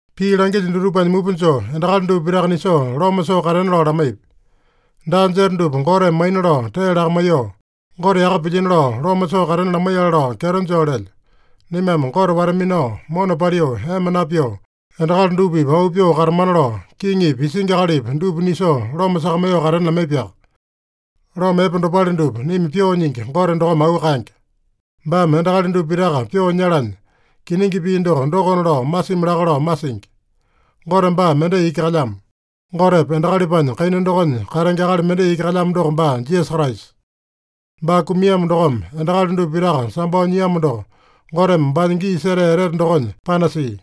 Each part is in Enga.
Pii langilyo dutupanya mupa joo endakali dupa pitaka nisoo loma soo katena lao lamaipi. Daa jeta dupa Goteme maina lao tee lakamaiyoo, Gote yaka pilyino lao loma soo katena lamaiyale lao kyeto joo lelyo. Naimame Gote wata-minao, mona paliu, ema napyoo, endakali dupa-pipa auu pyoo katamana lao, kiŋipi, isingi akalipi dupa nisoo loma sakamaiyoo katena lamaipiaka. Loma epe dopale dupa naima Pyoo Nyingi Gote dokome auu kaenge. Baame endakali dupa pitaka pyoo nyalanya, kiningi pii doko dokona lao masimi laka lao masingi. Gote baa mendai iki kalyamo. Gotepa endakalipanya kaina dokonya katenge akali mendai iki kalyamo doko baa Jisasa Kraisa. Baa kumiamo dokome, endakali dupa pitaka sambao nyiamo doko, Goteme baanya gii setea etete dokonya panasia.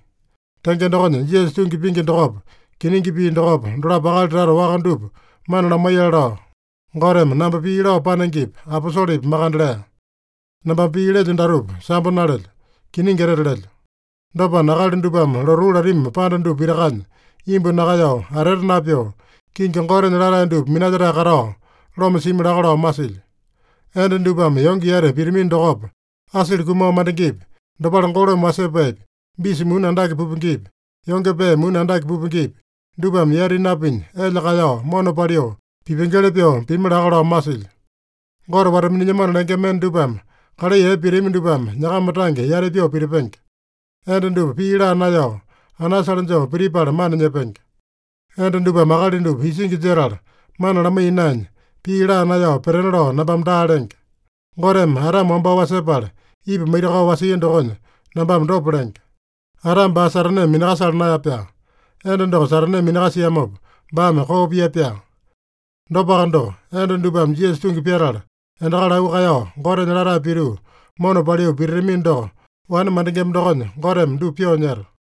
Tenge dokonya, Jisasa tungi pingi dokopa, kiningi pii dokopa, dolapo akali tata waka dupa mana lamaiyale lao, Goteme namba pii lao panengepi, aposolepi makande lea. (Nambame pii lelyo datupa sambo nalelyo. Kiningi etete lelyo.) Dopana, akali dupame lotuu latami panda dupa pitakanya imbu nakaeyao, atete napyoo, kingi Gotenya latae dupa minalyetae katao, loma simi laka lao masilyo. Enda dupame yonge yati pitamino dokopa, asili kumao mandengepi, dopale golome wasepaepi, bisa muni andake pupengepi, yonge pee muni andake pupengepi, dupame yati napinya, elya kaeyao, mona paliu, pipengeli pyoo pimi laka lao masilyo. Gote wata-minilyamano lengema enda dupame kalai epe pitami dupame nyakama tange yati pyoo pitipenge. Enda dupa pii laa naeyao, anasale joo pitipala mana nyepenge. Enda dupame akali dupa isingi jetala mana lamaiya naenya, pii laa naeyao petena lao nambame daa lenge. Goteme Adame wambao wasepala, Ipa maitakao wasia dokonya nambame dopa lenge. Adame baa Sataneme minakasala naeya-pyaa. Enda doko Sataneme minakasiamopa, baame koo pia-pyaa. Dopaka doko, enda dupame Jisasa tungi pyatala, endakali auu kaeyao, Gotenya latae pituu, mona paliu pititamino doko, wane mandengema dokonya Goteme dupa pyoo nyeta.